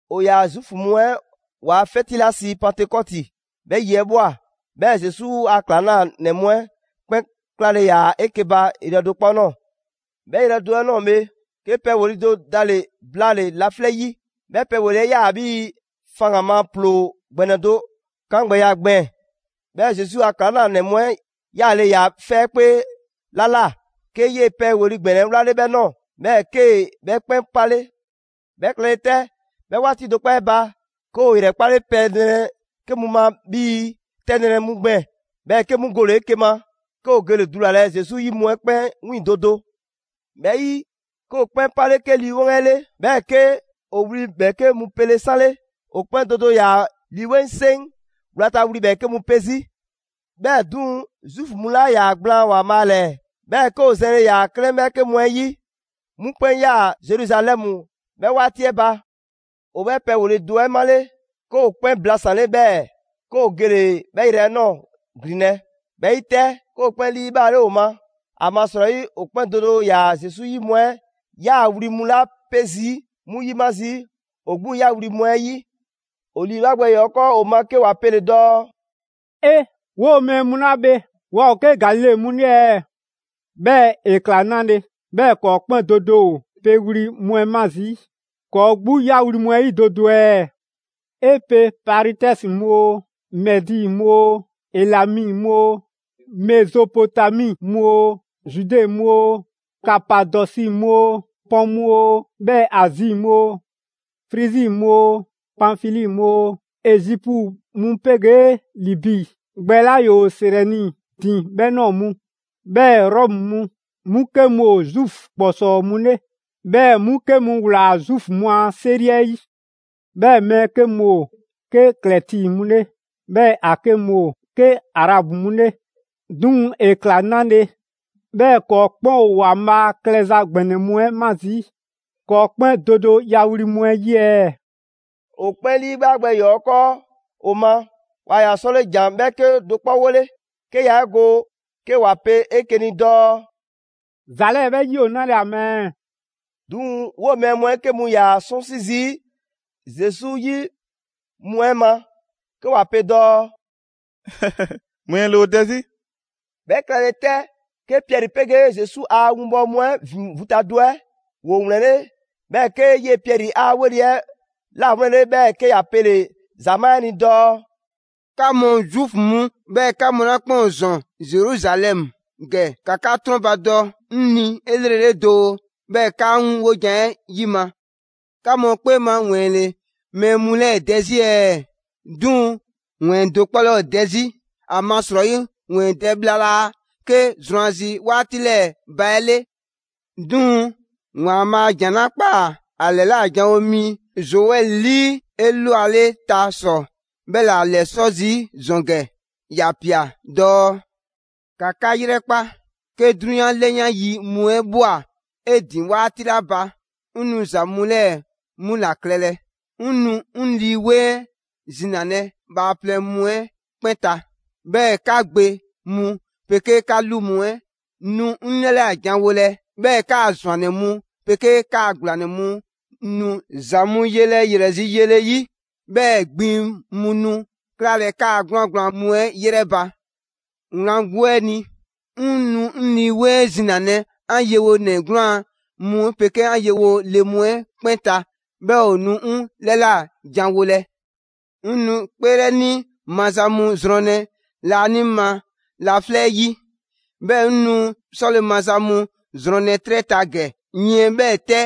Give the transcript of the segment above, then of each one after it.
‑O ‑yaa Zuufu mu 'ɛ ‑waa' 'fɛti 'la sii Pantekɔti, 'bhɛ yi 'ɛ ꞊bhwa, 'bhɛɛ‑ Zesu a ‑klaŋlanɛ mu 'ɛ 'kpɛn 'klale‑ ‑yaa 'eke‑ ba yrɛ do 'kpɔ ꞊nɔɔ. 'Bhɛ yrɛ do 'ɛ ꞊nɔɔ bhe, 'ke pɛ ‑weli' do dale‑ blaale‑ laflɛ' 'yi, 'bhɛ pɛ ‑weli' 'ɛ 'yaa‑ 'bhii‑ faŋgan‑ ma ‑ploo ‑gbɛnɛ do 'kangbɛya gbɛɛn‑, 'bhɛɛ‑ Zesu a ‑klaŋlanɛ mu 'ɛ ‑yaale' ‑yaa 'fɛ 'kpee 'la ꞊la, 'ke 'yee‑ pɛ ‑weli' ‑gbɛnɛ 'ɛ 'wlale 'bhɛ 'nɔɔ‑, 'bhɛɛ‑ 'kee‑ 'bhɛ 'kpɛn 'pale. 'Bhɛ klɛle 'tɛ, 'bhɛ 'waati do 'kpɔ 'ɛ ba, 'ke ‑o ‑yrɛkpale pɛ nrɛ 'ke mu ma 'bhii‑ 'tɛ nrɛ mu gbɛɛn‑. 'Bhɛɛ‑ 'ke 'mu gole‑ 'eke‑ ma, 'ke ‑o gele‑ dulalɛ Zesu 'yi mu 'ɛ 'kpɛn 'wiiŋ‑ do do. 'Bhɛ 'yi, 'ke ‑o 'kpɛn 'pale 'ke Lii 'Weŋ 'ɛ 'le, 'bhɛɛ‑ 'ke ‑o wli ‑bhɛɛke' mu pele 'sanle; ‑o 'kpɛn do do ‑yaa Lii 'Weŋ 'ɛ 'seŋ 'wlata‑ wli ‑bhɛɛke' mu 'pe 'zi. 'Bhɛɛ‑ 'duŋ‑, Zuufu mu 'la 'yaa‑ gblaan ‑Waanbhaa' ‑lɛɛ, 'bhɛɛ‑ 'ke ‑o zɛnle ‑yaa 'klɛɛn 'bhɛɛke mu 'ɛ 'yi, 'mu 'kpɛn ꞊yaa Zeruzalɛmu 'bhɛ 'waati 'ɛ ba. ‑O 'bhɛ pɛ ‑weli' do 'ɛ 'male‑, 'ke ‑o 'kpɛn blasanle 'bhɛɛ‑ 'ke ‑o gele‑ 'bhɛ yrɛ 'ɛ ꞊nɔɔ ‑glinlɛ'. 'Bhɛ 'yi 'tɛ, 'ke ‑o 'kpɛn 'liibhaale ‑o ma, ‑amasrɔyi ‑o 'kpɛn do do ‑yaa Zesu 'yi mu 'ɛ 'yaa‑ wli mu 'la 'pe zii' 'mu ‑yima' zii' ‑o 'gbu 'ya wli mu 'ɛ 'yi. ‑O ‑liibhaa' gbɛ ‑yɔɔ 'ɛ 'kɔɔ‑ ‑o ma 'ke ‑wa pele‑ dɔɔ: «'E! 'Woo‑ mɛɛ mu 'la bhe waa ‑o 'ke Galile mu 'le ɛɛ? 'Bhɛɛ‑ ‑e ꞊kla 'nale‑ 'bhɛɛ‑ ‑kɔɔ' 'kpɛn do do ‑o pe wli mu 'ɛ 'ma zii' ‑kɔɔ' 'gbu 'ya wli mu 'ɛ 'yi do do ɛɛ? 'E pe Paritɛsi mu oo, Mɛdi mu oo, Elami mu oo, Mezopotami mu oo, Zude mu oo, Kapadɔsi mu oo, Pɔn mu oo, 'bhɛɛ‑ Azi mu oo, Frizi mu oo, Panfili mu oo, Ezipu mu 'pegee Libi gbɛ 'la ‑yoo Sirɛni ‑din 'bhɛ ꞊nɔɔ mu, 'bhɛɛ‑ Rɔmu mu; 'mu 'ke mu ‑o Zuufu ‑kpɔsɔɔ mu 'le, 'bhɛɛ‑ 'mu 'ke mu ‑wlaa Zuufu mu a 'seri 'ɛ 'yi. 'Bhɛɛ‑ mɛɛ 'ke mu ‑o 'ke Krɛti mu 'le, 'bhɛɛ‑ ‑a 'ke mu ‑o 'ke Arabu mu 'le. 'Duŋ‑ ‑e ꞊kla 'nale‑, 'bhɛɛ‑ ‑kɔɔ' 'kpɛn ‑o ‑Waanbhaa' klɛza ‑gbɛnɛ mu 'ɛ 'ma zii' ‑kɔɔ' 'kpɛn do do ya wli mu 'ɛ 'yi ɛɛ?» ‑O 'kpɛn 'liibhaa gbɛ ‑yɔɔ' 'ɛ 'kɔɔ ‑o ma, waa ‑yaa 'sɔle ‑jan 'bhɛɛke do 'kpɔ 'wole, 'ke yaa 'e go 'ke ‑wa pe 'eke‑ ni dɔɔ: «‑Za 'lɛɛ‑ 'bhɛ 'yi ‑o 'nale‑ ‑a ma ɛɛ?» 'Duŋ‑ 'woo‑ mɛɛ mu 'ɛ 'ke mu ‑yaa 'sɔnsi zii' Zesu 'yi mu 'ɛ ma 'ke ‑wa pe dɔɔ: «‑wɛɛn ‑le ‑o dɛ 'zi!» 'Bhɛ klɛle 'tɛ, 'ke Piɛri 'pegee Zesu a winbɔwo mu ‑vin vu ta do 'ɛ ‑woo ‑wlɛnle', 'bhɛɛ‑ 'ke 'yee‑ Piɛri 'a 'weli‑ 'ɛ 'lawlɛnle, 'bhɛɛ‑ 'ke ‑ya pele‑ ‑zamaa' 'ɛ ni dɔɔ: «'Ka mu Zuufu mu, 'bhɛɛ‑ 'ka mu 'la 'kpɛn ‑o ‑zɔn Zeruzalɛmu ‑gɛ, ‑ka 'ka 'trɔnbadɔ 'ŋ ni 'elrele doo, 'bhɛɛ‑ ‑ka 'ŋ 'wojan‑ 'ɛ 'yima. 'Ka mu 'kpee ma ‑wɛɛn ‑le mɛɛ mu 'lɛɛ‑ dɛ 'zi ɛɛ? 'Duŋ‑ ‑wɛɛn do 'kpɔ 'laa ‑o dɛ 'zi, ‑amasrɔyi ‑wɛɛn dɛ bhla laa 'ke zrwanzi 'waati 'lɛɛ‑ ba 'ɛ 'le. 'Duŋ‑ ‑Waanbhaa' ‑jan 'la ꞊kpaa ‑a ‑lɛla' janwo mi Zoɛli 'lii 'elwaleta ‑sɔ 'bhɛ ‑la ‑lɛsɔ' zii' ‑zɔn ‑gɛ, ‑ya ꞊pia dɔɔ: ‹‑Ka 'ka 'yrɛkpa, 'ke 'drunyan 'lɛyan yi mu 'ɛ ꞊bhwa 'e ‑din 'waati 'la ba, 'ŋ nu ‑za mu 'lɛɛ‑ 'mu ‑la klɛlɛ: 'ŋ 'nu 'ŋ Lii 'Weŋ 'ɛ zinalɛ bhaaplɛŋ mu 'ɛ 'kpɛn ta, 'bhɛɛ‑ 'ka gbe mu 'pegee 'ka 'lu mu 'ɛ nu 'ŋ 'lɛla꞊ janwolɛ, 'bhɛɛ‑ 'kaa‑ ‑zwannɛ mu 'pegee 'kaa‑ ‑gblanɛ mu nu ‑za mu yelɛ ‑yrɛ zi yele 'yi; 'bhɛɛ‑ gbiŋ mu nu 'klalɛ‑ 'kaa‑ 'gwlaan‑ gblaan mu 'ɛ 'yrɛ ba. Wlan 'gbu 'ɛ ni, 'ŋ nu 'ŋ Lii 'Weŋ 'ɛ zinalɛ 'an yewonɛ 'gwlaan‑ mu 'pegee 'an yewo le mu 'ɛ 'kpɛn ta, 'bhɛɛ‑ ‑o nu 'ŋ 'lɛla꞊ janwolɛ. 'Ŋ nu 'kpeelɛni maza mu zrɔnlɛ laanima laflɛ' 'yi, 'bhɛɛ‑ 'ŋ nu 'sɔle‑ maza mu zrɔnlɛ 'trɛ ta ‑gɛ: yiɛn 'bhɛɛ‑ 'tɛ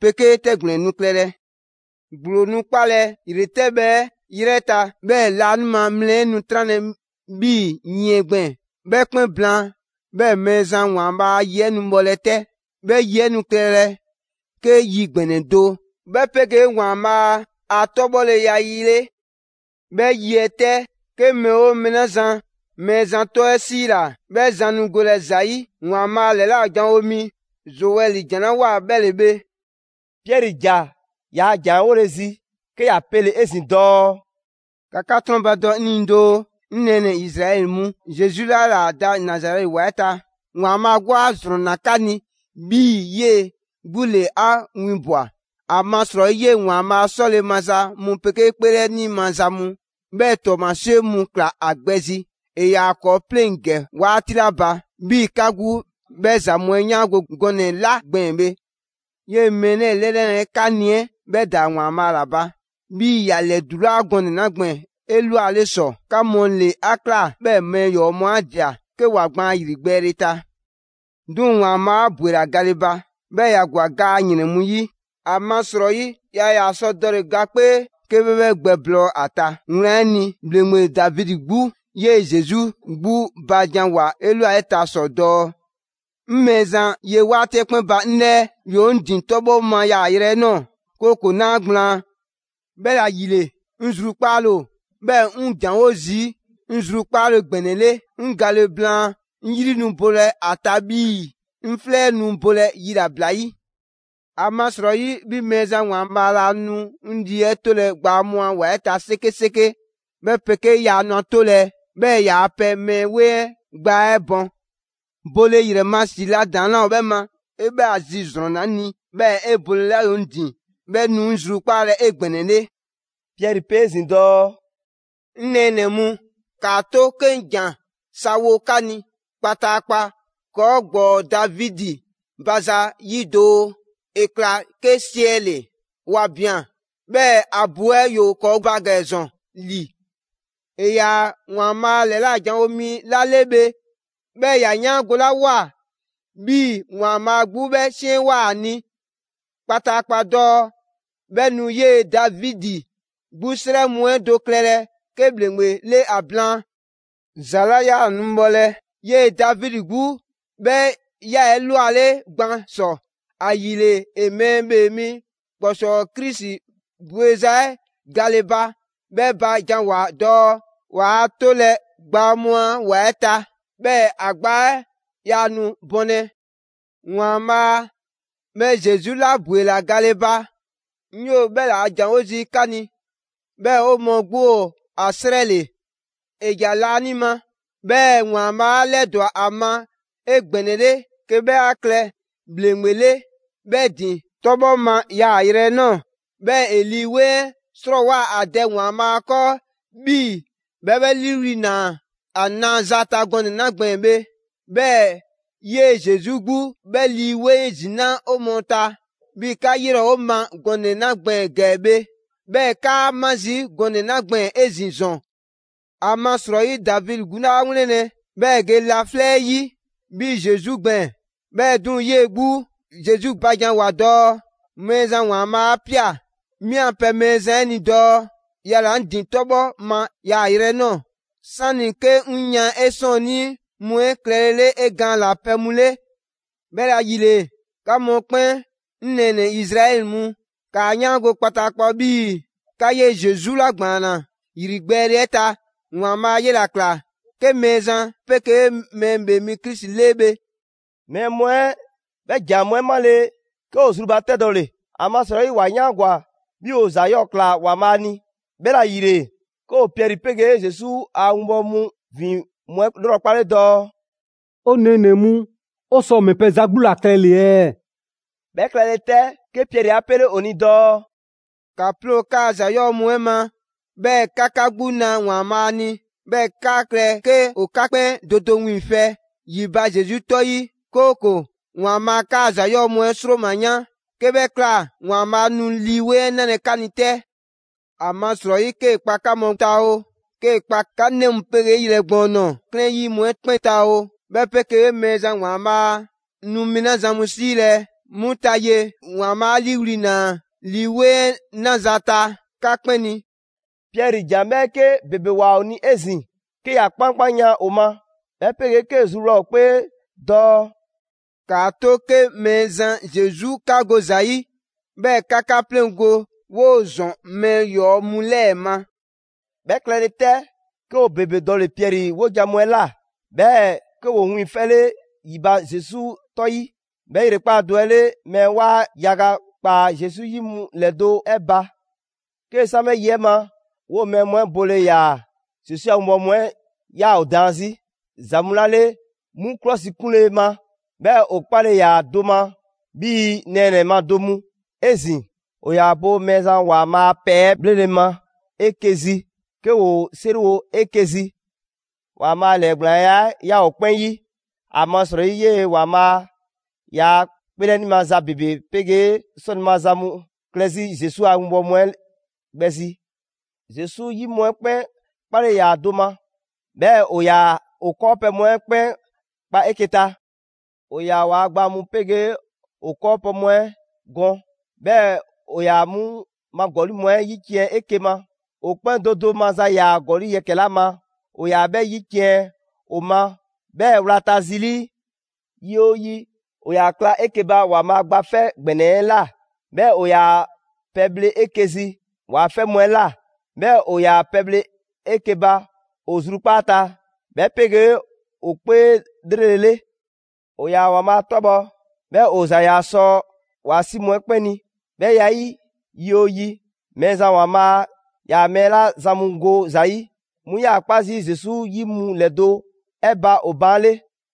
'pegee 'tɛgblɛn‑ nu klɛlɛ. ‑Gblo nu 'kpalɛ‑ ‑yretɛbhɛ 'ɛ 'yrɛ ta, 'bhɛɛ‑ laanima mlɛ 'ɛ nu 'tranlɛ‑ 'bhii yiɛn gbɛɛn‑. 'Bhɛ 'kpɛn blaan, 'bhɛɛ‑ Mɛɛzan ‑Waanbhaa' a yi 'ɛ nu bhɔlɛ 'tɛ, 'bhɛ yi 'ɛ nu klɛlɛ 'ke yi ‑gbɛnɛ do 'bhɛ 'pegee ‑Waanbhaa' a 'tɔbhɔleya yi 'le. 'Bhɛ 'yi 'ɛ 'tɛ, 'ke mɛɛ 'oo mɛɛ 'la zan Mɛɛzan 'tɔ 'ɛ ‑siila, 'bhɛ zan nu golɛ ‑za 'yi. ‑Waanbhaa' ‑lɛla' janwo mi Zoɛli ‑jan 'la ꞊woa 'bhɛ ‑le bhe.›» Piɛri ‑ja ‑yaa' ‑jan 'ɛ 'wole‑ zi 'ke ‑ya pele 'ezin‑ dɔɔ: «‑Ka 'ka 'trɔnbadɔ 'ŋ ni doo, 'ŋ nɛɛnɛ‑ Izraɛli mu: Zesu 'la 'yaa‑ da Nazarɛti ‑wa 'ɛ ta, ‑Waanbhaa' 'gbu 'a ‑zrɔnna 'ka ni 'bhii‑ 'yee‑ 'gbu ‑le 'a 'winbwa‑; ‑amasrɔyi 'yee‑ ‑Waanbhaa' 'sɔle‑ maza mu 'pegee 'kpeelɛni maza mu, 'bhɛɛ‑ ‑tɔɔmasie mu ꞊kla ‑a gbɛ zi ‑e ‑yaa ‑kɔɔ' 'pleŋ‑ ‑gɛ 'waati 'la ba; 'bhii‑ 'ka 'gbu 'bhɛ ‑za mu 'ɛ 'yaango‑ gɔnɛ‑ 'la gbɛɛn‑ bhe. 'Yee‑ mɛɛ 'lɛɛ‑ 'lɛnale 'ɛ 'ka ni 'ɛ 'bhɛ ‑daa ‑Waanbhaa' ‑la ba, 'bhii‑ ‑ya 'lɛdulaa gɔnɛ‑ 'la gbɛɛn‑ 'elwale ‑sɔ. 'Ka mu ‑le 'a ꞊kla 'bhɛɛ‑ mɛɛ ‑yɔɔ' mu 'a ꞊dia 'ke ‑wa gbaan ‑yrigbɛɛle ta. 'Duŋ‑ ‑Waanbhaa' 'a ‑bwela gale ba, 'bhɛɛ‑ ‑ya ‑gwa ga a ‑yrɛn mu 'yi. ‑Amasrɔyi yaa ‑yaa sɔ dɔle‑ ga 'kpee 'ke 'bhɛ 'bhɛ gbɛblɔɔ ‑a ta. Wlan 'ɛ ni, ‑bhleŋgbe Davidi 'gbu 'yee‑ Zesu 'gbu ba ‑janwoa 'elwaleta ‑sɔ dɔɔ: ‹'Ŋ Mɛɛzan ye 'waati 'ɛ 'kpɛn ba 'ŋ 'lɛɛ. ‑Yoo 'ŋ ‑din 'tɔbhɔ‑ ma yaayrɛ 'ɛ ꞊nɔɔ, 'kooko‑ 'naa ‑gblaan'. 'Bhɛla‑ ‑yile, 'ŋ zrukpaale ‑o, 'bhɛɛ‑ 'ŋ ‑janwo' zii' 'ŋ zrukpaale ‑gbɛnɛ 'le. 'Ŋ gale blaan, 'ŋ 'yri nu bolɛ ‑a ta 'bhii‑ 'ŋ 'flɛ 'ɛ nu bolɛ yilabla 'yi. ‑Amasrɔyi 'bhi Mɛɛzan ‑Waanbhaa' laa nu 'ŋ lii 'ɛ 'tolɛ‑ gbaa mu a ‑wa 'ɛ ta 'sekeseke, 'bhɛ 'pegee 'yaa nu ‑a 'tolɛ‑ 'bhɛɛ‑ 'yaa‑ pɛ mɛɛ 'weŋ 'ɛ gbaa 'ɛ bɔn. Bole ‑yrɛ ma ‑si 'la ‑daŋ' 'laa ‑o 'bhɛ ma, 'e 'bhɛ a zi ‑zrɔnna 'ŋ ni, 'bhɛɛ‑ 'e bolela ‑yoo 'ŋ ‑din 'bhɛ nu 'ŋ zrukpaalɛ 'egbɛnɛle.›» Piɛri pe 'ezin‑ dɔɔ: «'Ŋ nɛɛnɛ‑ mu, 'kaa‑ 'to 'ke 'ŋ ‑jan sa wo 'ka ni kpataakpa ‑kɔɔ' ‑gbɔɔ Davidi ba za 'yi doo: ‑e ꞊kla 'ke siɛle', ‑wa ꞊bian, 'bhɛɛ‑ ‑a bu 'ɛ ‑yoo ‑kɔɔ' ba ‑gɛ ‑zɔn ‑li. ‑E ‑yaa ‑Waanbhaa' ‑lɛla' janwo mi 'la 'le bhe, 'bhɛɛ‑ ‑ya 'yaangolawoa 'bhii‑ ‑Waanbhaa' 'gbu 'bhɛ 'siɛnwoa꞊ ‑a ni kpataakpa dɔɔ 'bhɛ nu 'yee‑ Davidi 'gbu 'srɛ mu 'ɛ do klɛlɛ 'ke ‑bhleŋgbe 'le ‑a blaan. ‑Za 'la 'yaa‑ nu bhɔlɛ, 'yee‑ Davidi 'gbu 'bhɛ ꞊ya 'elwale gban ‑sɔ, ‑ayile ‑e Mɛɛ ‑Bhee Mi ‑Kpɔsɔɔ Krisi bweza 'ɛ gale ba 'bhɛ ba janwoa‑ dɔɔ: ‹Waa ‑a 'tolɛ‑ gbaa mu a ‑wa 'ɛ ta, 'bhɛɛ‑ ‑a gbaa 'ɛ yaa nu bɔnlɛ.› ‑Waanbhaa' 'bhɛ Zesu 'la ‑bwela gale ba, 'ŋ 'yoo‑ 'bhɛ ‑laa' ‑janwo' zii' 'ka ni, 'bhɛɛ‑ 'o mɔɔ 'gbu ‑o ‑a 'srɛ 'le. ‑E ‑ja laanima, 'bhɛɛ‑ ‑Waanbhaa' 'a 'lɛdwa‑ ‑a ma 'egbɛnɛle 'ke 'bhɛ 'a klɛ ‑bhleŋgbe 'le 'bhɛ ‑din 'tɔbhɔ ma yaayrɛ 'ɛ ꞊nɔɔ. 'Bhɛɛ‑ ‑e Lii 'Weŋ 'ɛ 'srɔɔwoa‑ ‑a Dɛ ‑Waanbhaa' 'kɔɔ 'bhii‑ 'bhɛ 'bhɛ 'liiwli‑ ꞊naa ‑a naza ta gɔnɛ‑ 'la gbɛɛn‑ bhe. 'Bhɛɛ‑ 'yee‑ Zesu 'gbu 'bhɛ Lii 'Weŋ ‑zinaa' 'ɛ 'o mɔɔ ta, 'bhii‑ 'ka 'yrɛ ‑o ‑a ma gɔnɛ‑ 'la gbɛɛn‑ ‑gɛ bhe, 'bhɛɛ‑ 'kaa‑ ma 'zi gɔnɛ‑ 'la gbɛɛn‑ 'ezin‑ ‑zɔn. ‑Amasrɔyi, Davidi 'gbu 'laa 'wlɛnlɛ‑ 'bhɛɛ‑ ‑e ge laflɛ' 'yi 'bhii‑ Zesu gbɛɛn‑, 'bhɛɛ‑ 'duŋ‑, 'yee‑ 'gbu Zesu ba janwoa‑ dɔɔ: ‹Mɛɛzan ‑Waanbhaa' 'a ꞊pia 'mi a pɛ Mɛɛzan 'ɛ ni dɔɔ: Yala‑ 'ŋ ‑din 'tɔbhɔ ma yaayrɛ 'ɛ ꞊nɔɔ, 'sani‑ 'ke 'ŋ yan 'e 'sɔɔnnii mu 'ɛ klɛlele 'e gaan ꞊la pɛ mu 'le.› «'Bhɛla‑ ‑yile, 'ka mu 'kpɛn 'ŋ nɛɛnɛ‑ Izraɛli mu, ‑kaa 'yaango‑ kpataakpa 'bhii‑ 'ka 'yee‑ Zesu 'la ‑gbaanna ‑yrigbɛɛle 'ɛ ta, ‑Waanbhaa' 'yela‑ ꞊kla 'ke Mɛɛzan 'pegee Mɛɛ ‑Bhee Mi Krisi 'le bhe!» Mɛɛ mu 'ɛ 'bhɛ ‑jan mu 'ɛ 'male‑, 'ke ‑o zrubatɛdɔle (‑amasrɔyi ‑wa 'yaangwa‑ 'bhii‑ ‑o ‑za 'yɔɔ‑ ꞊kla ‑Waanbhaa' ni); 'bhɛla‑ ‑yile, 'ke ‑o Piɛri 'pegee Zesu a 'winbɔwo mu ‑vin mu 'ɛ 'lrɔkpale dɔɔ: «'O nɛɛnɛ‑ mu, 'o sɔ ‑mɛ pɛ za 'gbu ‑la klɛle‑ ɛɛ?» 'Bhɛ klɛle 'tɛ, 'ke Piɛri 'a 'pele ‑o ni dɔɔ: «‑Ka 'ploo‑ 'kaa‑ ‑za 'yɔɔ‑ mu 'ɛ ma, 'bhɛɛ‑ ‑ka 'ka 'gbu 'na ‑Waanbhaa' ni, 'bhɛɛ‑ ‑kaa klɛ 'ke ‑o 'ka 'kpɛn do do wiiŋfɛ ‑yi ba Zesu 'tɔ 'ɛ 'yi; 'kooko‑ ‑Waanbhaa' 'kaa‑ ‑za 'yɔɔ‑ mu 'ɛ 'sroma‑ yan. 'Ke 'bhɛ ꞊kla, ‑Waanbhaa' nu Lii 'Weŋ 'ɛ 'nalɛ‑ 'ka ni 'tɛ. ‑Amasrɔyi 'kee‑ kpa 'ka mu ta oo, 'kee‑ kpa 'ka 'nɛ mu 'pegee yrɛ gbɔɔn nɔɔ‑ 'klɛɛn 'yi mu 'ɛ 'kpɛn ta oo, 'bhɛ 'pegee‑ Mɛɛzan ‑Waanbhaa' nu mɛɛ 'la zan mu 'siilɛ‑ 'mu ta, 'yee‑ ‑Waanbhaa' 'a 'liiwli‑ ꞊naa Lii 'Weŋ 'ɛ 'naza‑ ta 'ka 'kpɛn ni.» Piɛri ‑jan 'bhɛɛke ‑bebe ꞊woa ‑o ni 'ezin‑ 'ke ‑ya 'kpankpanyan ‑o ma, 'bhɛ 'pegee 'kee‑ zruwla ‑o 'kpee dɔɔ: «‑Kaa 'to 'ke Mɛɛzan Zesu 'ka go ‑za 'yi, 'bhɛɛ‑ 'ka 'ka 'pleŋgo‑ 'woo‑ ‑zɔn mɛɛ ‑yɔɔ' mu 'lɛɛ‑ ma!» 'Bhɛ klɛle 'tɛ, 'ke ‑o ‑bebe dɔle‑ Piɛri 'wojan‑ mu 'ɛ ꞊la, 'bhɛɛ‑ 'ke ‑woo 'wiiŋfɛle ‑yi ba Zesu 'tɔ 'yi. 'Bhɛ ‑yrekpaa' do 'ɛ 'le, mɛɛ 'waa yaga ꞊kpaa Zesu 'yi mu ‑lɛdo' 'ɛ ba. 'Kee‑ san 'bhɛ yi 'ɛ ma, 'woo‑ mɛɛ mu 'ɛ bole ‑yaa Zesu a winbɔwo mu 'ɛ 'yaa‑ ‑o daan 'zi ‑za mu 'la 'le 'mu 'klɔsikunle ma, 'bhɛɛ‑ ‑o 'kpale‑ ‑yaa do ma 'bhii‑ nɛɛnɛ‑ ma do mu. 'Ezin‑ ‑o ‑yaa bo Mɛɛzan ‑Waanbhaa' a pɛ 'ɛ 'bhlele‑ ma 'eke‑ zi, 'ke ‑woo 'seriwo 'eke‑ zi. ‑Waanbhaa' ‑lɛɛgblaanya 'ɛ 'yaa‑ ‑o 'kpɛn 'yi, ‑amasrɔyi 'yee‑ ‑Waanbhaa' ‑yaa 'kpeelɛni maza ‑bebe 'pegee 'sɔle‑ maza mu klɛ 'zi Zesu a 'winbɔwo mu 'ɛ gbɛ zi. Zesu 'yi mu 'ɛ 'kpɛn 'kpale‑ ‑yaa do ma, 'bhɛɛ‑ ‑o ‑yaa ‑o 'kɔɔpɛ‑ mu 'ɛ 'kpɛn kpa 'eke‑ ta. ‑O ‑yaa ‑waa' gba mu 'pegee ‑o 'kɔɔpɛ‑ mu 'ɛ gɔn, 'bhɛɛ‑ ‑o ‑yaa 'mu ma ‑gɔli' mu 'ɛ 'yiciɛn‑ 'eke‑ ma. ‑O 'kpɛn do do maza ‑yaa ‑gɔli' yɛkɛ‑ 'la ma, ‑o ‑yaa 'bhɛ 'yiciɛn‑ ‑o ma 'bhɛɛ‑ wlata zi 'lii. Yi 'oo yi, ‑o ‑yaa kla 'eke‑ ba ‑Waanbhaa' Gba 'Fɛ ‑Gbɛnɛ 'ɛ ꞊la, 'bhɛɛ‑ ‑o ‑yaa pɛ 'ɛ bhle 'eke‑ zi ‑waa' 'fɛ mu 'ɛ ꞊la. 'Bhɛɛ‑ ‑o ‑yaa pɛbhle 'eke‑ ba ‑o zrukpaa' ta, 'bhɛ 'pegee ‑o 'kpee 'lrele‑ 'le. ‑O ‑yaa ‑Waanbhaa' 'tɔbhɔ‑, 'bhɛɛ‑ ‑o ‑za ‑yaa sɔ ‑waa' 'si mu 'ɛ 'kpɛn ni. 'Bhɛ ya 'ɛ 'yi, yi 'oo yi, Mɛɛzan ‑Waanbhaa' ‑yaa mɛɛ 'la zan mu go ‑za 'yi, 'mu 'yaa‑ 'kpa zii' Zesu 'yi mu ‑lɛdo' 'ɛ ba ‑o baan' 'le.